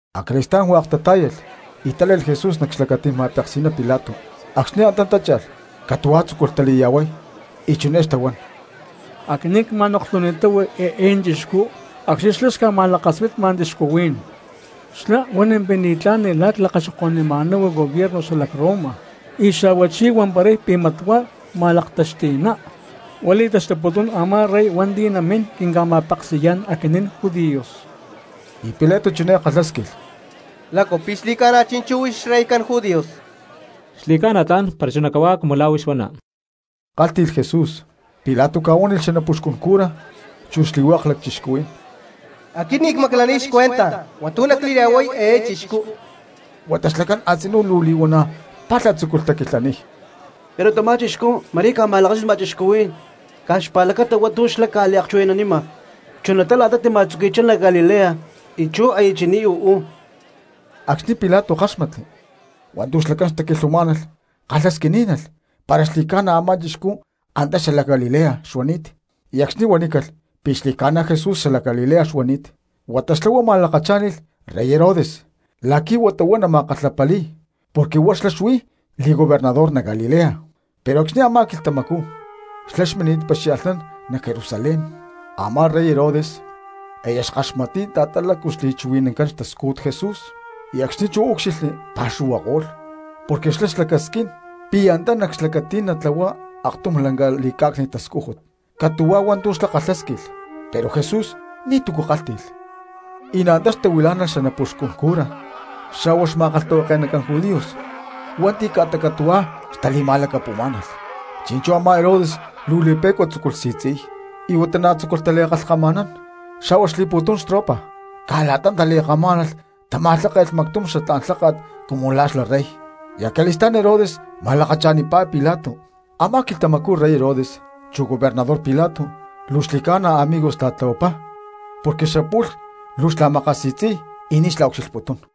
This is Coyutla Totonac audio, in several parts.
Acali̠stá̠n pu̠tum hua̠k tatá̠yalh y tále̠lh Jesús nac xlacatí̠n ma̠peksi̠ná Pilato. Acxni̠ antá tácha̠lh catu̠huá tzúculh tali̠ya̠huay y chiné xtahuán: —Aquinín cma̠noklhuni̠táhu eé chixcú acxni̠ xlá xca̠ma̠lakaspitma cristianos, xlá huan pi̠ mat ni̠tlá̠n la̠ clakaxoko̠nunima̠náhu gobierno xalac Roma, y xa̠huachí huamparay pi̠ mat huá ma̠laktaxti̠ná, huá li̠taxtuputún a̠má rey hua̠nti̠ namín quinca̠ma̠peksi̠yá̠n aquinín judíos. Y Pilato chiné kalhásquilh: —¿Lácu pi̠ xli̠ca̠na chi̠nchú huix xreycán judíos? —Xli̠ca̠na tla̠n para chuná cahuá cumu la̠ huix huana —kálhti̠lh Jesús. Pilato ca̠huánilh xanapuxcun cura chu xli̠hua̠k cristianos: —Aquit ni̠ cmaclaniy xcuenta hua̠ntu̠ nacli̠ya̠huay eé chixcú. Huata xlacán a̠tzinú luu li̠huana̠ palha tzúculh taquilhaniy: —Pero tamá chixcú ma̠rí ca̠ma̠lakaspitma cristianos caj xpa̠lacata hua̠ntu̠ xlá ca̠liakchuhui̠nanima, chunatá la̠ta tima̠tzuqui̠chá nac Galilea, y chú aya chini̠t uú. Acxni̠ Pilato káxmatli hua̠ntu̠ xlacán xtaquilhuamá̠nalh kalhasquiní̠nalh para xli̠ca̠na a̠má chixcú antá xalac Galilea xuani̠t. Y acxni̠ huanícalh pi̠ xli̠ca̠na Jesús xalac Galilea xuani̠t, huata xlá huá ma̠lakachá̠nilh rey Herodes la̠qui̠ huata huá nama̠kalhapali̠y porque huá xlá xuí li̠gobernador nac Galilea, pero acxni̠ a̠má quilhtamacú xlá xmini̠t paxia̠lhnán nac Jerusalén. Amá rey Herodes aya xkaxmatni̠t la̠ta lácu xli̠chuhui̠nancán xtascújut Jesús y acxni̠ chú úcxilhli pa̠xuhuako̠lh porque xlá xlacasquín pi̠ antá nac xlacatí̠n natlahuay aktum lanca li̠cá̠cni̠t tascújut. Catu̠huá hua̠ntu̠ xlá kalhásquilh pero Jesús ni̠tu̠cu kálhti̠lh. Y na̠ antá xtahuilá̠nalh xanapuxcun cura xa̠hua xma̠kalhtahuake̠nacán judíos hua̠nti̠ ca̠ta catu̠huá xtali̠ma̠lacapu̠má̠nalh. Chi̠nchú a̠má Herodes luu li̠pe̠cua tzúculh si̠tzi̠niy, y huata na̠ tzúculh tali̠kalhkama̠nán, xa̠hua xli̠pu̠tum xtropa, caj la̠ta tali̠kamá̠nalh tama̠lháke̠lh mactum xatlá̠n lháka̠t cumu la̠ xla rey; y acali̠stá̠n Herodes ma̠lakacha̠nipá Pilato. Amá quilhtamacú rey Herodes chu gobernador Pilato luu xli̠ca̠na amigos tala̠tlahuapá porque xapu̠lh luu xla̠makasi̠tzi̠y y ni̠ xla̠ucxilhputún.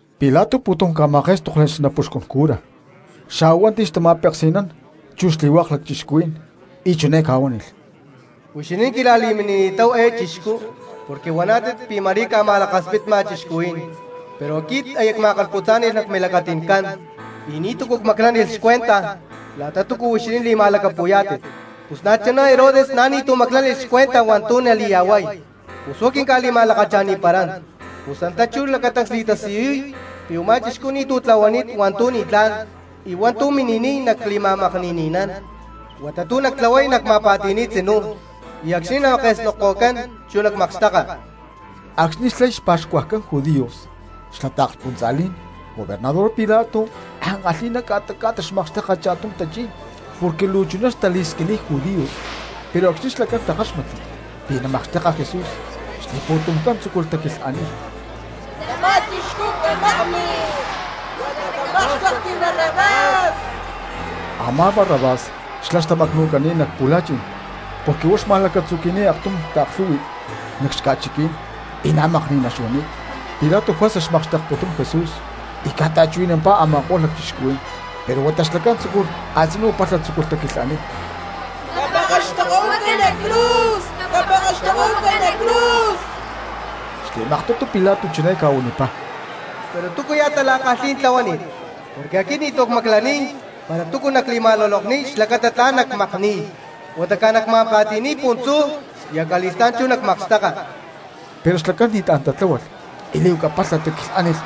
Pilato pu̠tum ca̠ma̠ké̠stokli xanapuxcun cura xa̠huá hua̠nti̠ xtama̠peksi̠nán chu xli̠hua̠k cristianos. Y chiné ca̠huánilh: —Huixinín quila̠li̠minini̠táhu eé chixcú porque huaná̠tit pi̠ ma̠rí ca̠ma̠lakaspitma cristianos; pero aquit aya cma̠kalhputzá̠ni̠lh nac milacati̠ncán y ni̠tu̠cu cmaclánilh xcuenta la̠ta túcua huixinín li̠ma̠lacapu̠yá̠tit. Pus na̠chuná Herodes na̠ ni̠tu̠ maclánilh xcuenta hua̠ntu̠ nali̠ya̠huay, pus huá quinca̠li̠ma̠lakacha̠niparán. Pus antá chú lacatancs li̠tasiyuy pi̠ u̠má chixcú ni̠tu̠ tlahuani̠t hua̠ntu̠ ni̠tlá̠n y hua̠ntu̠ mini̠niy nacli̠ma̠makni̠ni̠nán. Huata tu̠ nactlahuay nacma̠pa̠ti̠ni̠y tzinú y acxni̠ nake̠snokko̠cán chú nacmakxteka. Acxni̠ xlay xpa̠xcuajcán judíos xla taakspuntza̠lí̠n gobernador Pilato ankalhi̠ná ca̠ta ca̠ta xmakxteka cha̠tum tachí̠n porque luu chuná xtali̠squiniy judíos. Pero acxni̠ xlacán takáxmatli pi̠ namakxteka Jesús xli̠pu̠tumcán tzúculh taquilhaniy: —¡Tamá chixcú camakni! ¡Huata mejor xatlá̠n camákxtekti Barrabás! Amá Barrabás xlá xtamacnu̠cani̠t nac pu̠la̠chi̠n porque huá xma̠lacatzuqui̠ni̠t aktum taaklhú̠hui̠t nac xca̠chiquí̠n y na̠ ma̠kni̠ná xuani̠t. Pilato juerza xmakxtekputún Jesús y ca̠ta̠chuhui̠nampá a̠maktum cristianos. Pero huata xlacán a̠tzinú palha tzúculh taquilhaniy: —¡Capekextokohuaca nac cruz! ¡Capekextokohuaca nac cruz! Xli̠maktutu Pilato chiné ca̠huanipá: —¿Pero túcuya̠ tala̠kalhí̠n tlahuani̠t? Porque aquit ni̠tu̠ cmaclaniy para túcu nacli̠ma̠lulokniy xlacata tla̠n nacmakni̠y. Huata caj nacma̠pa̠ti̠niy puntzú y acali̠stá̠n chú nacmakxteka. Pero xlacán ni̠tlá̠n tatláhualh y li̠huaca palha taquilhánilh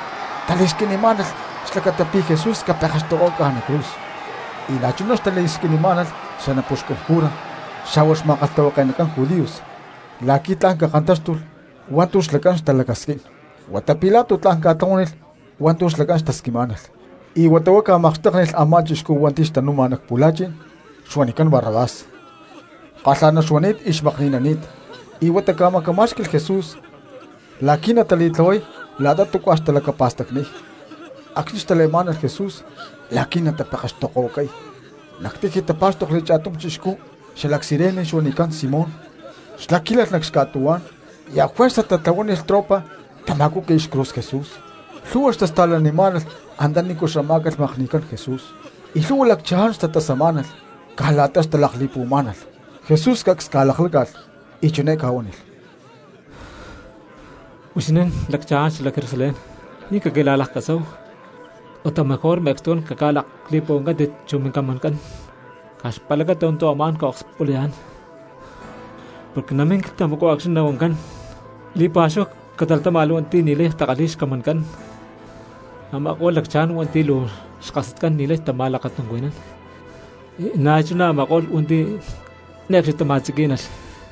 xtali̠squinimá̠nalh xlacata pi̠ Jesús capekextokohuacácalh nac cruz; y na̠chuná xtaquilhanimá̠nalh xanapuxcun cura xa̠hua xma̠kalhtahuake̠nacán judíos la̠qui̠ tla̠n cakantáxtulh hua̠ntu̠ xlacán xtalacasquín. Huata Pilato tla̠n ca̠tlahuánilh hua̠ntu̠ xlacán xtasquinimá̠nalh; y huata huá ca̠makxtéknilh a̠má chixcú hua̠nti̠ xtanu̠ma nac pu̠la̠chi̠n xuanicán Barrabás, caj kalha̠ná xuani̠t y xmakni̠nani̠t, y huata ca̠macamá̠xqui̠lh Jesús la̠qui̠ natali̠tlahuay la̠ta túcua xtalacapa̠stacniy. Acxni̠ xtale̠má̠nalh Jesús la̠qui̠ natapekextokohuacay, nac tiji tapá̠xtokli cha̠tum chixcú xalac Cirene xuanicán Simón, xlá quílalh nac xca̠tuhuá̠n y ajuerza tatlahuánilh tropa tama̠cúqui̠lh xcruz Jesús. Lhu̠hua cristianos xtasta̠lamá̠nalh antanícu xamá̠calh makni̠cán Jesús, y lhu̠hua lacchaján xtatasamá̠nalh caj la̠ta xtalakli̠puhuamá̠nalh. Jesús cacs ca̠lakláca̠lh y chiné ca̠huánilh: —Huixinín lacchaján xalac Jerusalén, ni̠ caquila̠laktasáhu, huata mejor me̠cstucán caca̠lakli̠puhuancántit chu mincamancán caj xpa̠lacata hua̠ntu̠ amá̠n ca̠okspulayá̠n. Porque namín quilhtamacú acxni̠ nahuancán: “Li̠pa̠xúhu catalatáma̠lh hua̠nti̠ ni̠lay takalhi̠y xcamancán, a̠ma̠ko̠lh lacchaján hua̠nti̠ luu xkasatcán y ni̠lay tama̠lakatuncuhui̠nán, y na̠chuná a̠ma̠ko̠lh hua̠nti̠ ne̠cxni tama̠tziquí̠nalh.”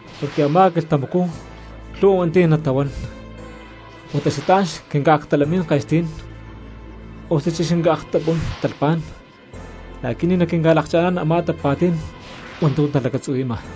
Porque a̠má quilhtamacú lhu̠hua hua̠nti̠ natahuán: “Huata xatlá̠n xquinca̠aktalamín ke̠sti̠ní̠n osuchí caquinca̠aktapunú̠n talhpá̠n la̠qui̠ ni̠ naquinca̠lakcha̠ná̠n a̠má tapa̠tí̠n hua̠ntu̠ talacatzuhui̠ma.”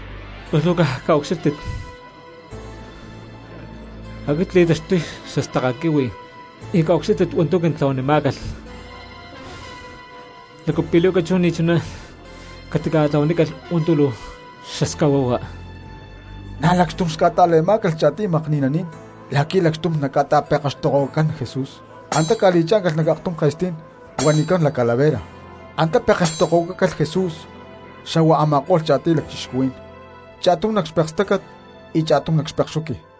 Pus luu caj caucxílhtit, aquit cli̠taxtuy xastaka quihui y caucxílhtit hua̠ntu̠ quintlahuanimá̠calh, ¿lácu pi̠ li̠huaca chú ni̠ chuná catitlahuanícalh hua̠ntu̠ luu xascahuahua? Na̠ lacxtum xca̠ta̠le̠má̠calh cha̠tiy makni̠naní̠n la̠qui̠ lacxtum naca̠ta̠pekextokohuacacán Jesús. Antá ca̠li̠chá̠ncalh nac aktum ke̠stí̠n huanicán La Calavera, antá pekextokohuacácalh Jesús xa̠hua a̠ma̠ko̠lh cha̠tiy lacchixcuhuí̠n, cha̠tum nac xpekstácat y cha̠tum nac xpekxuqui.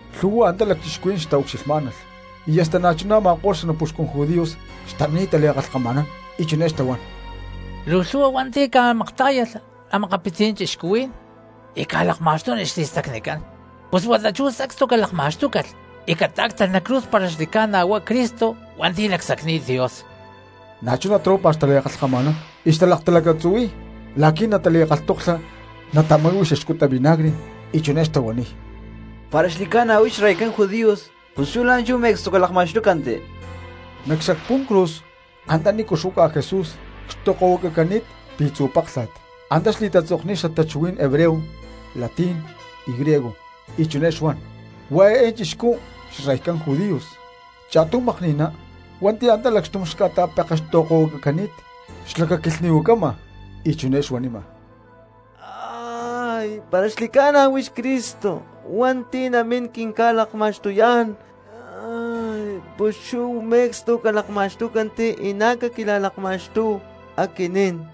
Lhu̠hua cristianos antá xtaucxilhmá̠nalh, y hasta na̠chuná a̠ma̠ko̠lh xanapuxcun judíos xtamini̠t tali̠kalhkama̠nán y chiné xtahuán: —Luu lhu̠hua hua̠nti̠ ca̠maktá̠yalh a̠makapitzí̠n cristianos y ca̠lakma̠xtúnilh xli̠stacnicán, ¡pus huata chú sacstu calakma̠xtúcalh y catá̠ctalh nac cruz para xli̠ca̠na chú huá Cristo hua̠nti̠ lacsacni̠t Dios! Na̠chuná tropa xtali̠kalhkama̠nán y xtalaktalacatzuhui̠y la̠qui̠ natali̠kalhtoklha natama̠hui̠y xaxcuta vinagre. Y chiné xtahuaniy: —Para xli̠ca̠na huix xreycán judíos pus chú la̠nchú me̠cstu calakma̠xtúcanti. Nac xacpú̠n cruz antanícu xuaca Jesús cxtokohuacacani̠t pi̠tzu̠ páklha̠t, antá xli̠tatzokni̠t xatachuhuí̠n hebreo, latín y griego, y chiné xuan: “Huá eé chixcú xreycán judíos.” Cha̠tum makni̠ná hua̠nti̠ antá lacxtum xca̠ta̠pekextokohuacacani̠t xlacaquilhni̠huacama y chiné xuanima: —¡Para xli̠ca̠na huix Cristo hua̠nti̠ namín quinca̠lakma̠xtuyá̠n pus chú me̠cstu calakma̠xtúcanti y na̠ caquila̠lakma̠xtúhu aquinín!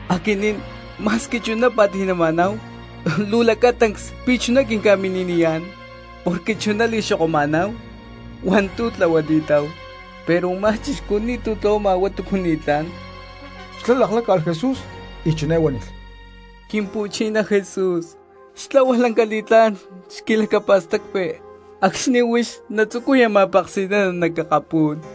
Aquinín ma̠squi chuná pa̠ti̠nama̠náhu luu lacatancs pi̠ chuná quinca̠mini̠niyá̠n, porque chuná li̠xoko̠numa̠náhu hua̠ntu̠ tlahuani̠táhu, pero u̠má chixcú ni̠tu̠ tlahuama para túcu ni̠tlá̠n. Xlá lakláca̠lh Jesús y chiné huánilh: —Quimpu̠chiná Jesús, xtlahua lanca li̠tlá̠n xquilacapa̠stacpi acxni̠ huix natzucuya ma̠peksi̠nana nac akapú̠n.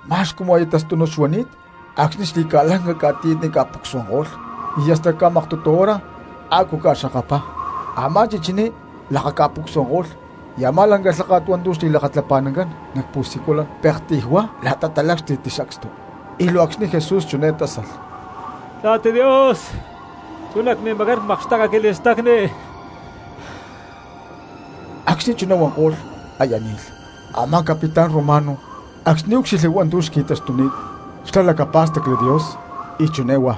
Ma̠x cumu aya tastúnut xuani̠t acxni̠ xli̠ca̠lanca ca̠tiyatni ca̠pucsuananko̠lh y hasta ca̠maktutu hora a̠cú ca̠xkakapá. Amá chichiní lakaca̠pucsuananko̠lh y a̠má lanca lháka̠t hua̠ntu̠ xli̠lakatlapa̠nancán nac pu̠siculan pektiy huá la̠ta talácxti̠tli sacstu. Y luu acxni̠ Jesús chiné tásalh: —¡Papá Dios, chú nac mimacán cmakxteka quili̠stacni! Acxni̠ chuná huanko̠lh aya ni̠lh. Amá capitán romano acxni̠ úcxilhli hua̠ntu̠ xqui̠taxtuni̠t xlá lacapá̠stacli Dios y chiné huá: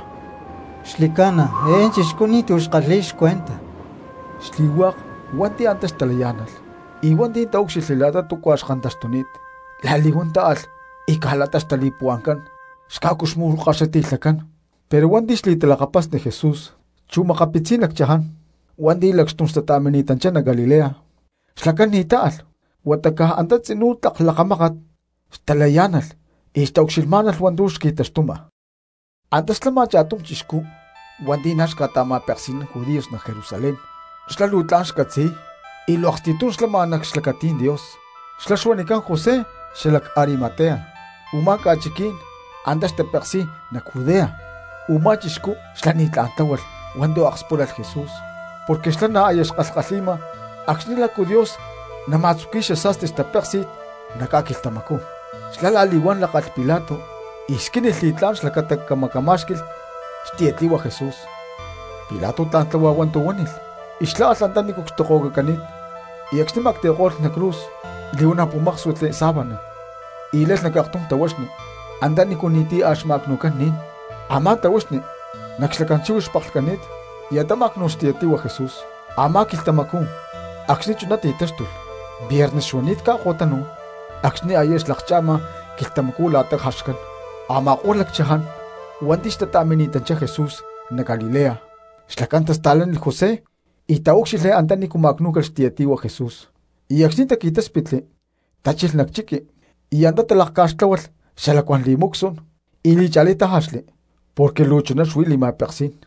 —Xli̠ca̠na eé chixcú ni̠tu̠ xkalhi̠y xcuenta. Xli̠hua̠k cristianos hua̠nti̠ antá xtalayá̠nalh y hua̠nti̠ taúcxilhli la̠ta túcua xkantaxtuni̠t, la̠li̠huán táalh y caj la̠ta xtali̠puhua̠ncán xca̠cuxmu̠kaxiti̠lhacán. Pero hua̠nti̠ xli̠talakapasni Jesús, chu makapitzí̠n lacchaján hua̠nti̠ lacxtum xca̠ta̠mini̠tanchá nac Galilea, xlacán ni̠ táalh huata caj antá tzinú tlak lakamákat xtalacayá̠nalh y xtaucxilhmá̠nalh hua̠ntu̠ xqui̠taxtuma. Antá xlama cha̠tum chixcú hua̠nti̠ na̠ xca̠ta̠ma̠peksi̠nán judíos nac Jerusalén, xlá luu tla̠n xcatzi̠y y luu aksti̠tum xlama nac xlacatí̠n Dios, xlá xuanicán José xalac Arimatea, u̠má ca̠chiquí̠n antá xtapeksi̠y nac Judea. Umá chixcú xlá ni̠tlá̠n tláhualh hua̠ntu̠ akspúlalh Jesús porque xlá na̠ aya xkalhkalhi̠ma acxni̠ lácu Dios nama̠tzuqui̠y xasa̠sti xtapéksi̠n nac ca̠quilhtamacú. Xlá la̠li̠huán lákalh Pilato y squínilh li̠tlá̠n xlacata camacamá̠xqui̠lh xtiyatli̠hua Jesús. Pilato tla̠n tláhua hua̠ntu̠ huánilh y xlá alh antanícu cxtokohuacacani̠t y acxni̠ ma̠cti̠ko̠lh nac cruz, li̠huana̠ pu̠máksuitli sábana y le̠lh nac aktum tahuaxni antanícu ni̠ti̠ a̠ xma̠cnu̠cán ni̠n; a̠má tahuaxni nac xlacán chíhuix xpaklhcani̠t y antá má̠cnu̠lh xtiyatli̠hua Jesús. Amá quilhtamacú acxni̠ chuná ti̠táxtulh viernes xuani̠t ca̠ko̠tanu̠n acxni̠ aya xlakcha̠ma quilhtamacú la̠ta jaxcán. Ama̠ko̠lh lacchaján hua̠nti̠ xtata̠mini̠tanchá Jesús nac Galilea xlacán tasta̠lánilh José y taúcxilhli antanícu ma̠cnú̠calh xtiyatli̠hua Jesús. Y acxni̠ taqui̠táspitli, tachilh nac chiqui y antá talakca̠xtláhualh xalacuán perfumes y li̠cha̠lí tájaxli porque luu chuná xuí li̠ma̠peksí̠n.